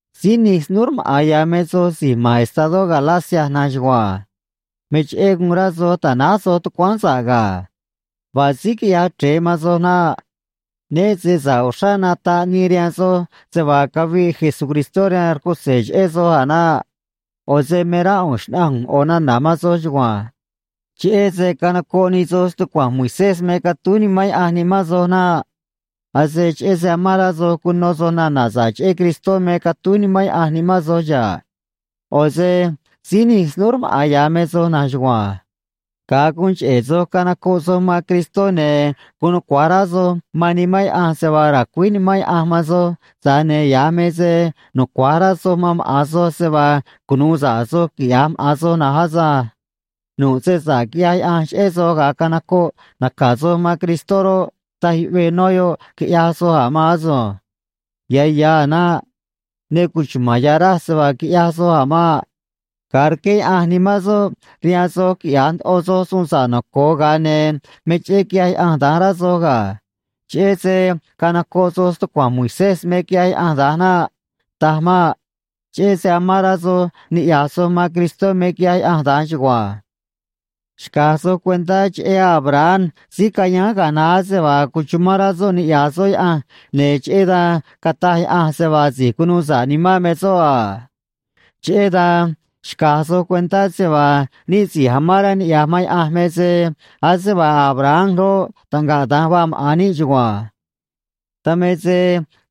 Síí nij snúú rmaꞌa̱n ya̱ me soj si̱j ma̱n estadó Galacia na̱nj chugua̱nj. Me cheꞌé guun rá soj ta̱náj soj tucuáán sa̱ꞌ ga̱. Vaa síí quiꞌyaj chre̱e man soj naꞌ. Né se sa̱ꞌ uxrá nataꞌ nii rihaan soj se vaa caviꞌ Jesucristó rihaan rcutze̱ cheꞌé soj a̱ naꞌ. ꞌO̱ se me rá ꞌu̱nj xna̱ꞌanj ꞌu̱nj ꞌo̱ nana̱ man soj chugua̱nj: Cheꞌé se canocoꞌ nij soj stucua̱nj Moisés me catúj Nimán Yaꞌanj nimán soj naꞌ. Ase cheꞌé se amán rá soj cuno soj nana̱ sa̱ꞌ cheꞌé Cristó me catúj Nimán Yaꞌanj nimán soj xa̱ꞌ. ꞌO̱ se síí nij snúú rmaꞌa̱n ya̱ me soj na̱nj chugua̱nj. Ga̱a guun cheꞌe̱ soj canocoꞌ soj man Cristó, ne̱ guun nucua̱j rá soj man Nimán Yaꞌanj se vaa ra̱cuíj Nimán Yaꞌanj man soj, tza̱j ne̱ ya̱j me se nucua̱j rá soj man maꞌa̱n soj se vaa cunu̱u sa̱ꞌ soj quiꞌya̱j maꞌa̱n soj na̱nj asânj. Nu̱ꞌ se sa̱ꞌ quiꞌyaj Yaꞌanj cheꞌé soj ga̱a canocoꞌ naca̱ soj man Cristó roꞌ, taj yuꞌvee nó yoꞌ, quiꞌyaj soj a̱ maan asunj. Ya̱ ya̱ a̱ naꞌ. Ne cuchuma̱n ya̱ raj se vaa quiꞌyaj soj a̱ maꞌ. Ga̱a rqué Yaꞌanj Nimán soꞌ rihaan soj quiꞌya̱j ndoꞌo soj suun sa̱ꞌ noco̱o, ga̱a ne̱ me cheꞌé quiꞌyaj Yaꞌanj da̱nj, rá soj ga̱. Cheꞌé se canocoꞌ soj stucua̱nj Moisés me quiꞌyaj Yaꞌanj da̱nj naꞌ. Taj maꞌ. Cheꞌé se amán rá soj niꞌya̱j soj man Cristó me quiꞌyaj Yaꞌanj da̱nj chugua̱nj. Xca̱j soj cuentá cheꞌé Abraham síí cayáán ga̱a naá se vaa cuchumán rá soꞌ niꞌya̱j soꞌ Yaꞌanj, ne̱ cheꞌé dan cataj Yaꞌanj se vaa si̱j cunuu sa̱ꞌ nimán me soꞌ a. Cheꞌé dan xca̱j soj cuentá se vaa níꞌ si̱j amán rá niꞌya̱j man Yaꞌanj me se ase vaa Abraham roꞌ, taꞌngaꞌ da̱nj vaa maꞌa̱n níꞌ chugua̱nj. Dan me se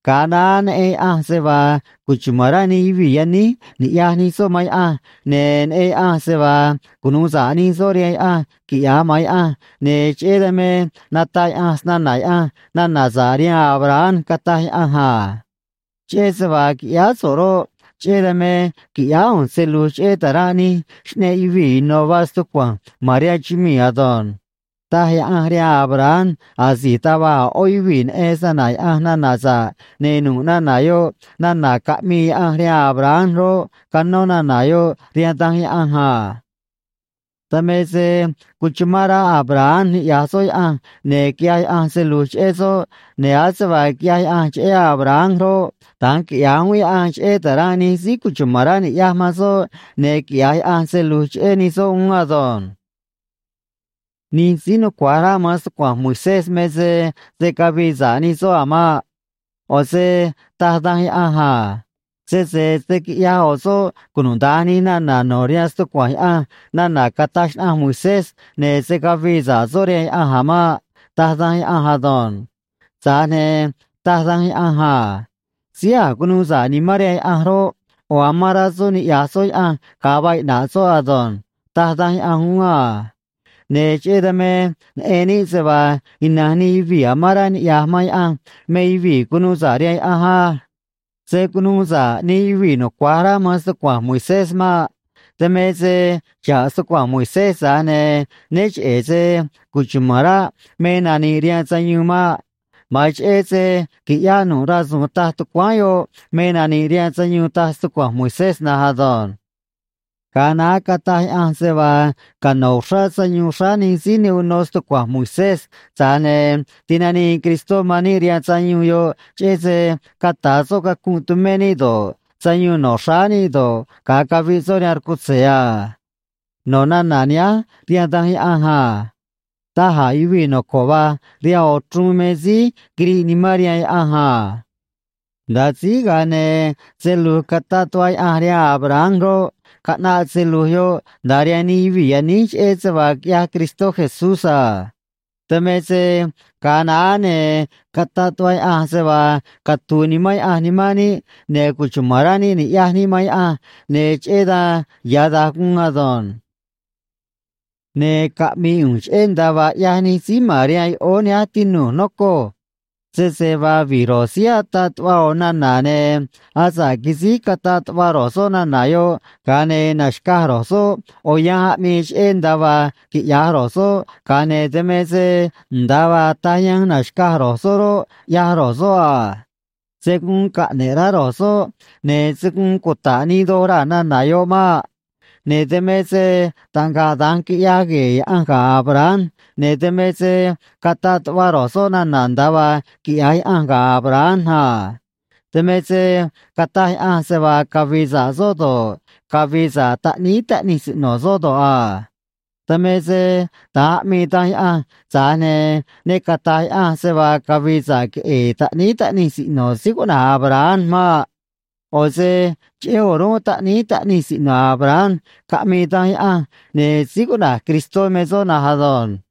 ga̱a naá neꞌen Yaꞌanj se vaa cuchuma̱n rá nij yuvii̱ yaníj ni̱ꞌyaj nij soꞌ man Yaꞌanj, ne̱ neꞌen Yaꞌanj se vaa cunu̱u sa̱ꞌ nij soꞌ rihaan Yaꞌanj, quiꞌya̱j maꞌa̱n Yaꞌanj, ne̱ cheꞌé dan me nataꞌ Yaꞌanj snana̱ Yaꞌanj nana̱ sa̱ꞌ rihaan Abraham, cataj Yaꞌanj a: “Cheꞌé se vaa quiꞌyáá so̱ꞌ roꞌ, cheꞌé dan me qui̱ꞌyáá ꞌu̱nj se lu̱j cheꞌé ta̱ranꞌ nij xꞌneꞌ yuvii̱ ino̱ vaa stucua̱nj ma̱n rihaan chumii̱ ado̱nj”, taj Yaꞌanj rihaan Abraham asi̱j taj va̱j a̱ ꞌó yuvii̱ neꞌen snana̱ Yaꞌanj nana̱ sa̱ꞌ, ne̱ nu̱ꞌ nana̱ yoꞌ nana̱ caꞌmii Yaꞌanj rihaan Abraham roꞌ, canó nana̱ yoꞌ rihaan Danj Yaꞌanj a. Dan me se cuchumán rá Abraham niꞌya̱j soꞌ Yaꞌanj, ne̱ quiꞌyaj Yaꞌanj se lu̱j cheꞌé soꞌ, ne̱ ase vaa quiꞌyaj Yaꞌanj cheꞌé Abraham roꞌ, da̱nj quiꞌya̱j uún Yaꞌanj cheꞌé ta̱ranꞌ nij síí cuchuma̱n rá ni̱ꞌyaj man soꞌ, ne̱ quiꞌya̱j Yaꞌanj se lu̱j cheꞌé nij soꞌ uún ado̱nj. Nij síí nucua̱j rá man stucua̱nj Moisés me se se̱ cavii sa̱ꞌ nij soꞌ a̱ maꞌ. ꞌO̱ se taj Danj Yaꞌanj a: “Sese se̱ quiꞌyaj ꞌo̱ soꞌ cunuda̱nj nij nana̱ no̱ rihaan stucua̱nj Yaꞌanj nana̱ cataj xnaꞌanj Moisés, ne̱ se̱ cavii sa̱ꞌ soꞌ rihaan Yaꞌanj a̱ maꞌ”, taj Danj Yaꞌanj ado̱nj. Tza̱j ne̱ taj Danj Yaꞌanj a: “Síí a̱j cunuu sa̱ꞌ nimán rihaan Yaꞌanj roꞌ, ꞌo̱ amán rá soꞌ niꞌya̱j soꞌ Yaꞌanj ga̱a vaa iꞌna̱ꞌ soꞌ ado̱nj”, taj Danj Yaꞌanj uún a. Ne̱ cheꞌé dan me neꞌen níꞌ se vaa ina̱nj nij yuvii̱ amán rá niꞌya̱j man Yaꞌanj me yuvii̱ cunu̱u sa̱ꞌ rihaan Yaꞌanj á. Se̱ cunuu sa̱ꞌ nij yuvii̱ nucua̱j rá man stucua̱nj Moisés maꞌ. Dan me se xa̱ꞌ stucua̱nj Moisés, tza̱j ne̱ né cheꞌe̱ se cuchuma̱n ráꞌ me nani̱ꞌ rihaan sayuun maꞌ. Ma̱an cheꞌé se qui̱ꞌyáꞌ nu̱ꞌ rasu̱u̱n taj tucuáán yoꞌ me nani̱ꞌ rihaan sayuun, taj stucua̱nj Moisés na̱nj ado̱nj. Ga̱a naá cataj Yaꞌanj se vaa cano̱ uxrá sayuun xráá nij síí ne uno nu̱ꞌ stucua̱nj Moisés, tza̱j ne̱ tinanii Cristó man níꞌ rihaan sayuun yoꞌ cheꞌé se cata̱ soꞌ cacunꞌ tumé níꞌ do̱ꞌ, sayuun no̱ xráá níꞌ do̱ꞌ, ga̱a caviꞌ soꞌ rihaan rcutze̱ a. No̱ nana̱ nihánj rihaan Danj Yaꞌanj a: “Daj a̱ yuvii̱ noco̱ꞌ va̱j rihaan ꞌo̱ chruun me síí quiriꞌ nimán rihaan Yaꞌanj a.” Nda̱a síj, ga̱a ne̱ se lu̱j cataꞌ tuꞌva Yaꞌanj rihaan Abraham roꞌ, caꞌnaꞌ se lu̱j yoꞌ nda̱a rihaan nij yuvii̱ yaníj, cheꞌé se vaa quiꞌyaj Cristó Jesús a. Dan me se ga̱a naá, ne̱ cataꞌ tuꞌva Yaꞌanj se vaa catu̱u̱ Nimán Yaꞌanj nimán níꞌ, ne̱ cuchumán rá níꞌ niꞌya̱j níꞌ man Yaꞌanj, ne̱ cheꞌé dan ya̱ da̱nj guun ado̱nj. Ne̱ caꞌmi̱i̱ ꞌu̱nj cheꞌé nda̱a vaa ꞌyaj nij síí ma̱n rihaan yoꞌóó nihánj, tinu̱j, nocoj. Sese vaa vi̱j ro̱j síí ataꞌ tuꞌva ꞌo̱ nana̱, ne̱ asa̱ꞌ quisíj cataꞌ tuꞌva ro̱j soꞌ nana̱ yoꞌ, ga̱a ne̱ naxca̱j ro̱j soꞌ ꞌo̱ yanj aꞌmii cheꞌé nda̱a vaa quiꞌya̱j ro̱j soꞌ, ga̱a ne̱ dan me se nda̱a vaa taj yanj naxca̱j ro̱j soꞌ roꞌ, ꞌyaj ro̱j soꞌ a. Se̱ guun caꞌne̱ꞌ rá ro̱j soꞌ, ne̱ se̱ guun cuta̱ꞌ nii doj raa̱ nana̱ yoꞌ maꞌ. Ne̱ dan me se taꞌngaꞌ da̱nj quiꞌyaj gue̱e̱ Yaꞌanj ga̱ Abraham, ne̱ dan me se cataꞌ tuꞌva ro̱j soꞌ nana̱ nda̱a vaa quiꞌya̱j Yaꞌanj ga̱ Abraham a. Dan me se cataj Yaꞌanj se vaa cavi̱i̱ sa̱ꞌ soꞌ do̱ꞌ, cavi̱i̱ sa̱ꞌ taꞌníí taꞌnij siꞌno̱ soꞌ do̱ꞌ a. Dan me se da̱nj aꞌmii Danj Yaꞌanj, tza̱j ne̱ ne cata̱j Yaꞌanj se vaa cavi̱i̱ sa̱ꞌ queꞌe̱e̱ taꞌníí taꞌnij siꞌno̱ síí cuꞌna̱j Abraham maꞌ. ꞌO̱ se cheꞌé o̱rúnꞌ taꞌníí taꞌnij siꞌno̱ Abraham caꞌmii Danj Yaꞌanj, ne̱ síí cuꞌna̱j Cristó me soꞌ na̱nj ado̱nj.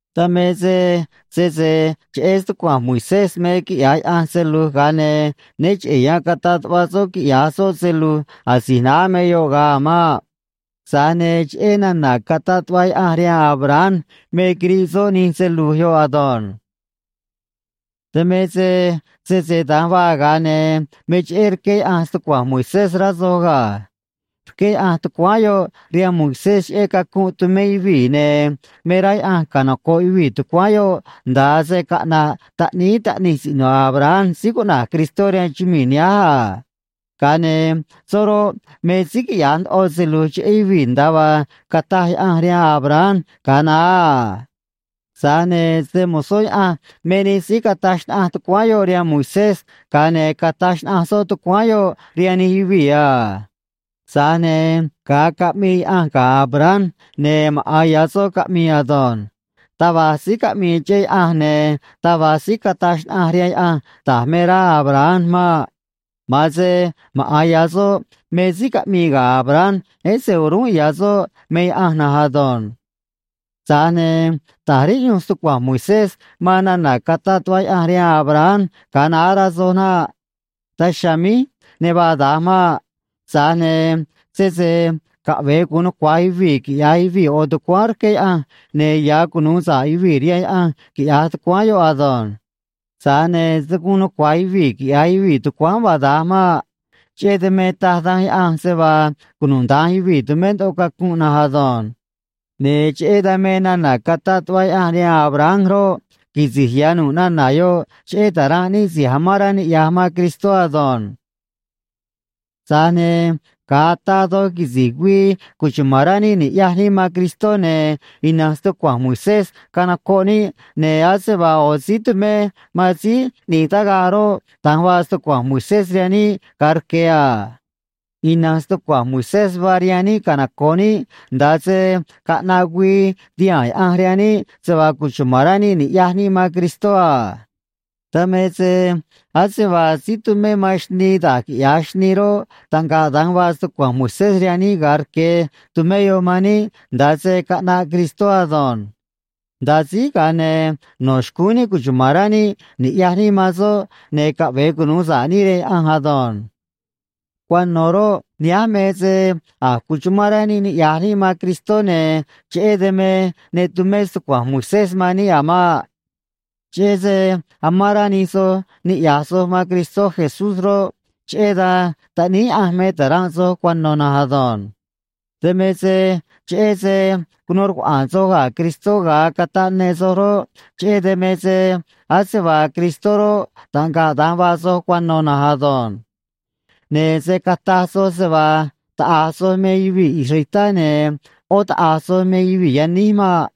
Dan me se sese cheꞌé stucua̱nj Moisés me quiꞌya̱j Yaꞌanj se lu̱j, ga̱a ne̱ né cheꞌe̱ yan cataꞌ tuꞌva soꞌ quiꞌya̱j soꞌ se lu̱j asi̱j naá me yoꞌ ga̱a a̱ maꞌ. Tza̱j ne̱ cheꞌé nana̱ cataꞌ tuꞌva Yaꞌanj rihaan Abraham me quiriꞌ soꞌ nij se lu̱j yoꞌ ado̱nj. Dan me se sese da̱nj vaa, ga̱a ne̱ me cheꞌé rqué Yaꞌanj stucua̱nj Moisés, rá soj ga̱. Rqué Yaꞌanj tucuáán yoꞌ rihaan Moisés cheꞌé cacunꞌ tumé yuvii̱, ne̱ me rá Yaꞌanj canoco̱ꞌ yuvii̱ tucuáán yoꞌ nda̱a se caꞌna̱ꞌ taꞌníí taꞌnij siꞌno̱ Abraham síí cuꞌna̱j Cristó rihaan chumii̱ nihánj a. Ga̱a ne̱ soꞌ roꞌ, me síí quiꞌya̱j ndoꞌo se lu̱j cheꞌé yuvii̱, nda̱a vaa cataj Yaꞌanj rihaan Abraham ga̱a naá a. Tza̱j ne̱ se‑mo̱zó Yaꞌanj me nij síí cataj xnaꞌanj tucuáán yoꞌ rihaan Moisés, ga̱a ne̱ cataj xnaꞌanj soꞌ tucuáán yoꞌ rihaan nij yuvii̱ a. Tza̱j ne̱ ga̱a caꞌmii Yaꞌanj ga̱ Abraham, ne̱ maꞌa̱n ya̱ soꞌ caꞌmii ado̱nj. Taj va̱j síí caꞌmii cheꞌé Yaꞌanj, ne̱ taj va̱j síí cataj xnaꞌanj rihaan Yaꞌanj da̱j me rá Abraham maꞌ. Ma̱an se maꞌa̱n ya̱ soꞌ me síí caꞌmii ga̱ Abraham, ese o̱rúnꞌ ya̱ soꞌ me Yaꞌanj na̱nj ado̱nj. Tza̱j ne̱ ta̱j riꞌyunj stucua̱nj Moisés man nana̱ cataꞌ tuꞌva Yaꞌanj rihaan Abraham ga̱a naá, rá soj naꞌ. Daj chiha̱a̱ míj ne vaa da̱nj maꞌ. Tza̱j ne̱ sese caꞌve̱e gu̱un nucua̱j yuvii̱ quiꞌya̱j yuvii̱ ꞌo̱ tucuáán rqué Yaꞌanj, ne̱ ya̱ cunu̱u sa̱ꞌ yuvii̱ rihaan Yaꞌanj, quiꞌya̱j tucuáán yoꞌ ado̱nj. Tza̱j ne̱ se̱ guun nucua̱j yuvii̱ quiꞌya̱j yuvii̱ tucuáán vaa da̱nj maꞌ. Cheꞌé dan me taj Danj Yaꞌanj se vaa cunuda̱nj yuvii̱ tumé ndoꞌo cacunꞌ na̱nj ado̱nj. Ne̱ cheꞌé dan me nana̱ cataꞌ tuꞌva Yaꞌanj rihaan Abraham roꞌ, quisi̱j ya̱ nu̱ꞌ nana̱ yoꞌ cheꞌé ta̱ranꞌ níꞌ si̱j amán rá niꞌya̱j man Cristó ado̱nj. Tza̱j ne̱ ga̱a ataa doj quisi̱j güii cuchuma̱n rá níꞌ ni̱ꞌyaj níꞌ man Cristó, ne̱ ina̱nj stucua̱nj Moisés canocoꞌ níꞌ, ne̱ ase vaa ꞌo̱ síí tumé man síí ꞌni̱j tagaꞌ roꞌ, da̱nj vaa stucua̱nj Moisés rihaan níꞌ ga̱a rque̱ a. Ina̱nj stucua̱nj Moisés vaa rihaan níꞌ canoco̱ꞌ níꞌ nda̱a se caꞌnaꞌ güii tihaa̱n Yaꞌanj rihaan níꞌ se vaa cuchuma̱n rá níꞌ ni̱ꞌyaj níꞌ man Cristó a. Dan me se ase vaa síí tumé man xnii da̱j quiꞌya̱j xnii roꞌ, taꞌngaꞌ da̱nj vaa stucua̱nj Moisés rihaan níꞌ ga̱a rque̱, tumé yoꞌ man níꞌ nda̱a se caꞌnaꞌ Cristó ado̱nj. Nda̱a síj, ga̱a ne̱ no̱ xcúún níꞌ cuchuma̱n rá níꞌ ni̱ꞌyaj níꞌ man soꞌ, ne̱ caꞌve̱e cunu̱u sa̱ꞌ níꞌ rihaan Yaꞌanj ado̱nj. Cuano̱ roꞌ, nihánj me se a̱j cuchumán rá níꞌ niꞌya̱j níꞌ man Cristó, ne̱ cheꞌé dan me ne tumé stucua̱nj Moisés man níꞌ a̱ maꞌ. Cheꞌé se amán rá nij soj niꞌya̱j soj man Cristó Jesús roꞌ, cheꞌé dan taꞌníí Yaꞌanj me ta̱ranꞌ soj cuano̱ na̱nj ado̱nj. Dan me se cheꞌé se cunuu rcuaꞌa̱a̱n soj ga̱ Cristó ga̱a cataꞌ ne soj roꞌ, cheꞌé dan me ase vaa Cristó roꞌ, taꞌngaꞌ da̱nj vaa soj cuano̱ na̱nj ado̱nj. Ne̱ se̱ cataj soj se vaa taꞌa̱j soj me yuvii̱ israelitá ne̱ ꞌó taꞌa̱j soj me yuvii̱ yaníj maꞌ.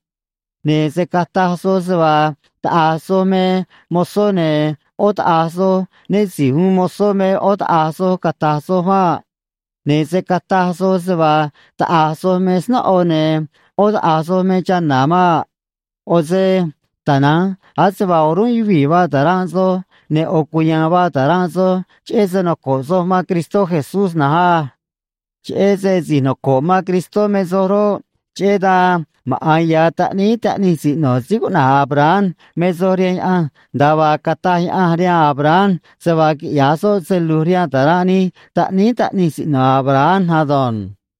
Ne̱ se̱ cataj soj se vaa taꞌa̱j soj me mozó ne̱ ꞌó taꞌa̱j soj, né si̱j uun mozó me ꞌó taꞌa̱j soj, cata̱j soj maꞌ. Ne̱ se̱ cataj soj se vaa taꞌa̱j soj me snóꞌo ne̱ ꞌó taꞌa̱j soj me chana̱ maꞌ. ꞌO̱ se tana̱nj ase vaa o̱rúnꞌ yuvii̱ vaa ta̱ranꞌ soj, ne̱ ꞌo̱ cuya̱a̱n vaa ta̱ranꞌ soj cheꞌé se noco̱ꞌ soj man Cristó Jesús na̱nj á. Cheꞌé se si̱j noco̱ꞌ man Cristó me soj roꞌ, cheꞌé dan maꞌa̱n ya̱ taꞌníí taꞌnij siꞌno̱ síí cuꞌna̱j Abraham me soj rihaan Yaꞌanj, nda̱a vaa cataj Yaꞌanj rihaan Abraham se vaa quiꞌya̱j soꞌ se lu̱j rihaan ta̱ranꞌ nij taꞌníí taꞌnij siꞌno̱ Abraham ado̱nj.